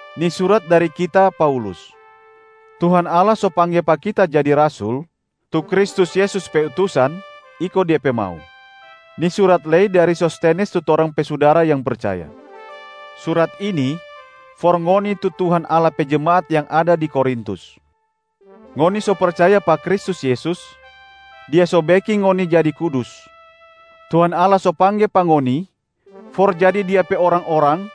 Ni surat dari kita, Paulus. Tuhan Allah so pangge pa kita jadi rasul tu Kristus Yesus pe utusan iko Dia pe mau. Ni surat lei dari Sostenes tu torang pe sudara yang percaya. Surat ini for ngoni tu Tuhan Allah pe jemaat yang ada di Korintus. Ngoni so percaya pa Kristus Yesus, Dia so beking ngoni jadi kudus. Tuhan Allah so pangge pa ngoni for jadi Dia pe orang-orang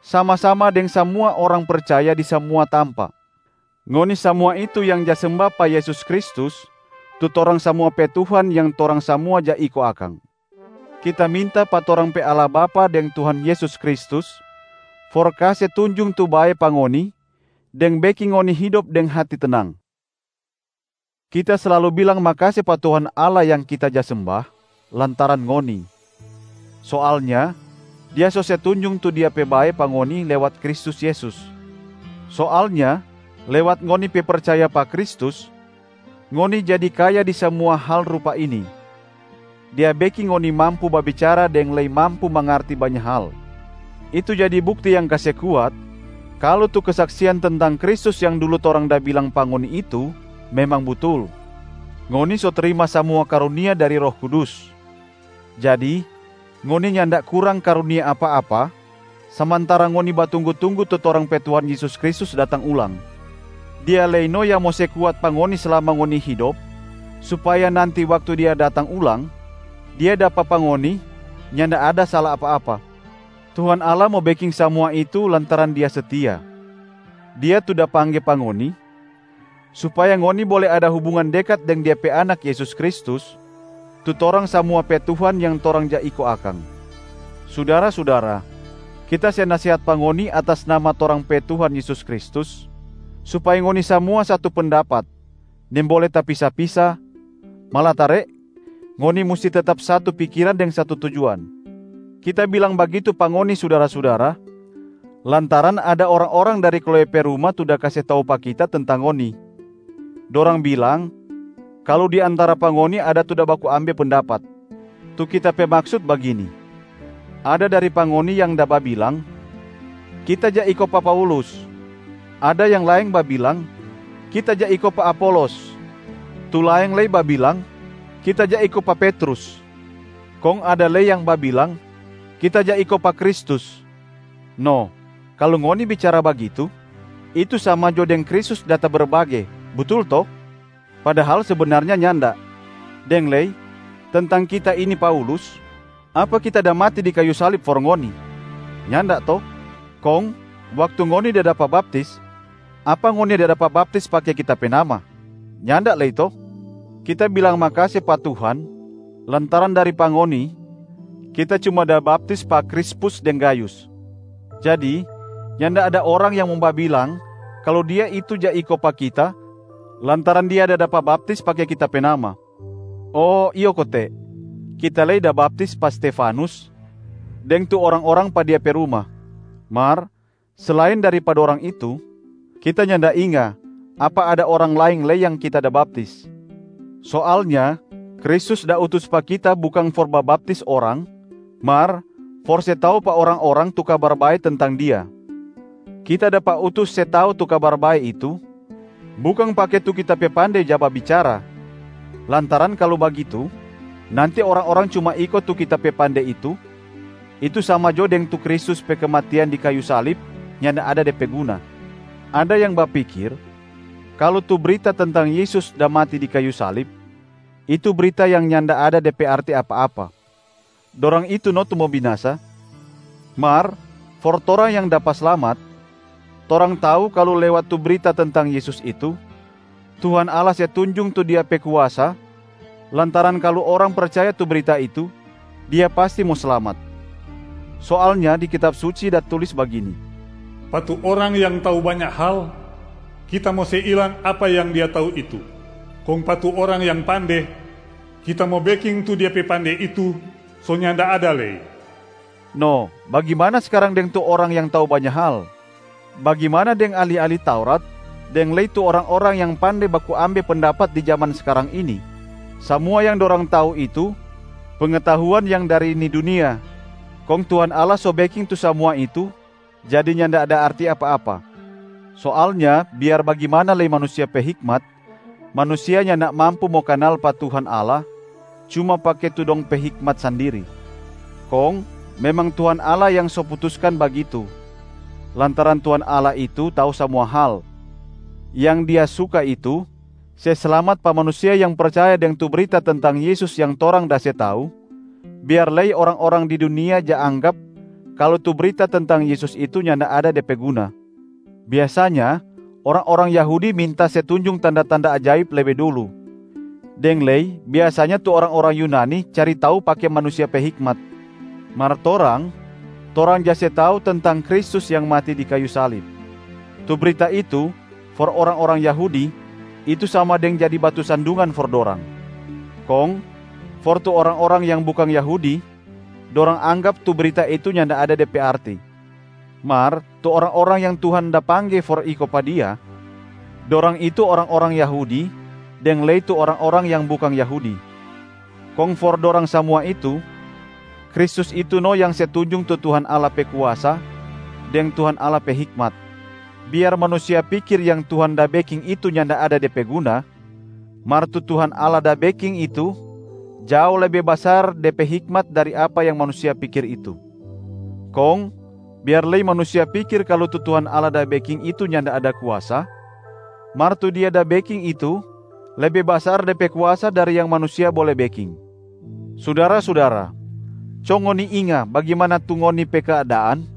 sama-sama deng samua orang percaya di samua tampa. Ngoni samua itu yang ja semba pa Yesus Kristus tu torang samua pe Tuhan yang torang samua ja iko akang. Kita minta pa torang pe Allah Bapa deng Tuhan Yesus Kristus for kase tunjung tu bae pa ngoni deng beking ngoni hidop deng hati tenang. Kita slalu bilang makase pa Tuhan Allah yang kita ja semba lantaran ngoni. Soalnya Dia so se tunjung tu Dia pe bae pa ngoni lewat Kristus Yesus. Soalnya lewat ngoni pe percaya pa Kristus, ngoni jadi kaya di samua hal rupa ini: Dia beking ngoni mampu babicara deng lei mampu mangarti banya hal. Itu jadi bukti yang kase kuat kalu tu kesaksian tentang Kristus yang dulu torang da bilang pa ngoni itu memang butul. Ngoni so trima samua karunia dari Roh Kudus, jadi ngoni nyanda kurang karunia apa-apa samantara ngoni batunggu-tunggu tu torang pe Tuhan Yesus Kristus datang ulang. Dia lei no yang mo se kuat pa ngoni slama ngoni hidop supaya nanti waktu Dia datang ulang, Dia dapa pa ngoni nyanda ada sala apa-apa. Tuhan Allah mo beking samua itu lantaran Dia setia. Dia tu da pangge pa ngoni supaya ngoni bole ada hubungan dekat deng Dia pe Anak Yesus Kristus, tu torang samua pe Tuhan yang torang ja iko akang. Sudara-sudara, kita se nasehat pa ngoni atas nama torang pe Tuhan Yesus Kristus, supaya ngoni samua satu pendapat, nimbole tapisa-pisa, malatare ngoni musti tetap satu pikiran deng satu tujuan. Kita bilang bagitu pa ngoni sudara-sudara, lantaran ada orang-orang dari Kloe pe ruma tu da kase tau pa kita tentang ngoni. Dorang bilang kalu di antara pa ngoni ada tu da baku ambe pendapat. Tu kita pe maksut bagini: ada dari pa ngoni yang da babilang, “Kita ja iko pa Paulus.” Ada yang laeng babilang, “Kita ja iko pa Apolos.” Tu laeng lei babilang, “Kita ja iko pa Petrus.” Kong ada lei yang babilang, “Kita ja iko pa Kristus.” No kalu ngoni bicara bagitu, itu sama jo deng Kristus da taberbage, butul to? Padahal sebenarnya nyanda. Deng lei tentang kita ini Paulus, apa kita da mati di kayu salib for ngoni? Nyanda to? Kong waktu ngoni da dapa baptis, apa ngoni da dapa baptis pake kita pe nama? Nyanda lei to? Kita bilang makase pa Tuhan lantaran dari pa ngoni, kita cuma da baptis pa Krispus deng Gayus. Jadi nyanda ada orang yang mo babilang kalu dia itu ja iko pa kita lantaran dia da dapa baptis pake kita pe nama. Oh iyo kote, kita lei da baptis pa Stefanus deng tu orang-orang pa dia pe ruma. Mar selain dari pa dorang itu, kita nyanda inga apa ada orang laeng lei yang kita da baptis. Soalnya Kristus da utus pa kita bukang for babaptis orang mar for se tau pa orang-orang tu Kabar Bae tentang Dia. Kita dapa utus se tau tu Kabar Bae itu bukang pake tu kita pe pande ja babicara, lantaran kalu bagitu nanti orang-orang cuma iko tu kita pe pande itu, itu sama jo deng tu Kristus pe kematian di kayu salib nyanda ada de pe guna. Ada yang bapikir kalu tu brita tentang Yesus da mati di kayu salib, itu brita yang nyanda ada de pe arti apa-apa. Dorang itu no tu mo binasa. Mar for torang yang dapa slamat, torang tau kalu lewat tu brita tentang Yesus itu, Tuhan Allah se tunjung tu Dia pe kuasa lantaran kalu orang percaya tu brita itu, dia pasti mo slamat. Soalnya di Kitab Suci da tulis bagini, “Pa tu orang yang tau banya hal, Kita mo se ilang apa yang dia tau itu. Kong pa tu orang yang pande, Kita mo beking tu dia pe pande itu so nyanda ada lei.” No bagimana skarang deng tu orang yang tau banya hal? Bagimana deng ahli-ahli Taurat deng lei tu orang-orang yang pande baku ambe pendapat di jaman skarang ini? Samua yang dorang tau itu pengetahuan yang dari ni dunia, kong Tuhan Allah so beking tu samua itu jadi nyanda ada arti apa-apa. Soalnya biar bagimana lei manusia pe hikmat, manusia nyanda mampu mo kanal pa Tuhan Allah cuma pake tu dong pe hikmat sandiri. Kong memang Tuhan Allah yang so putuskan bagitu, lantaran Tuhan Allah itu tau samua hal. Yang Dia suka itu, se slamat pa manusia yang percaya deng tu brita tentang Yesus yang torang da se tau, biar lei orang-orang di dunia ja anggap kalu tu brita tentang Yesus itu nyanda ada de pe guna. Biasanya orang-orang Yahudi minta se tunjung tanda-tanda ajaib lebe dulu, deng lei biasanya tu orang-orang Yunani cari tau pake manusia pe hikmat. Mar torang, torang ja se tau tentang Kristus yang mati di kayu salib. Tu brita itu for orang-orang Yahudi, itu sama deng jadi batu sandungan for dorang. Kong for tu orang-orang yang bukang Yahudi, dorang anggap tu brita itu nyanda ada de pe arti. Mar tu orang-orang yang Tuhan da pangge for iko pa Dia, dorang itu orang-orang Yahudi deng lei tu orang-orang yang bukang Yahudi. Kong for dorang samua itu, Kristus itu no yang se tunjung tu Tuhan Allah pe kuasa deng Tuhan Allah pe hikmat. Biar manusia pikir yang Tuhan da beking itu nyanda ada de pe guna, mar tu Tuhan Allah da beking itu jao lebe basar de pe hikmat dari apa yang manusia pikir itu. Kong biar lei manusia pikir kalu tu Tuhan Allah da beking itu nyanda ada kuasa, mar tu Dia da beking itu lebe basar de pe kuasa dari yang manusia bole beking. Sudara-sudara, co ngoni inga bagimana tu ngoni pe keadaan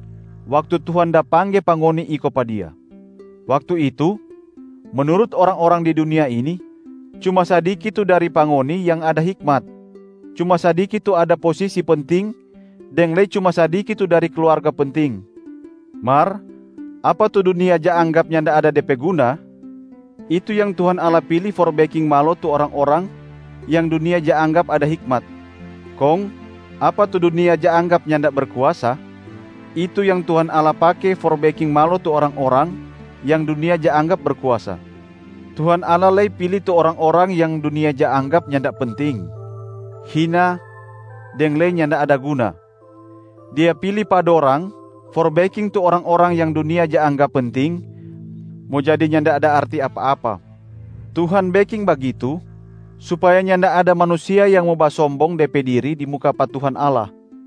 waktu Tuhan da pangge pa ngoni iko pa Dia. Waktu itu, menurut orang-orang di dunia ini, cuma sadiki tu dari pa ngoni yang ada hikmat, cuma sadiki tu ada posisi penting deng lei cuma sadiki tu dari kluarga penting. Mar apa tu dunia ja anggap nyanda ada de pe guna, itu yang Tuhan Allah pili for beking malo tu orang-orang yang dunia ja anggap ada hikmat. Kong apa tu dunia ja anggap nyanda berkuasa, itu yang Tuhan Allah pake for beking malo tu orang-orang yang dunia ja anggap berkuasa. Tuhan Allah lei pili tu orang-orang yang dunia ja anggap nyanda penting, hina deng lei nyanda ada guna. Dia pili pa dorang for beking tu orang-orang yang dunia ja anggap penting mo jadi nyanda ada arti apa-apa. Tuhan beking bagitu supaya nyanda ada manusia yang mo basombong de pe diri di muka pa Tuhan Allah.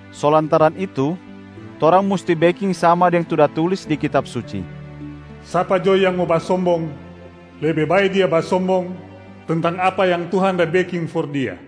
So lantaran itu, torang musti beking sama deng tu da tulis di Kitab Suci, “Sapa jo yang mo basombong, lebe bae dia basombong tentang apa yang Tuhan da beking for dia.”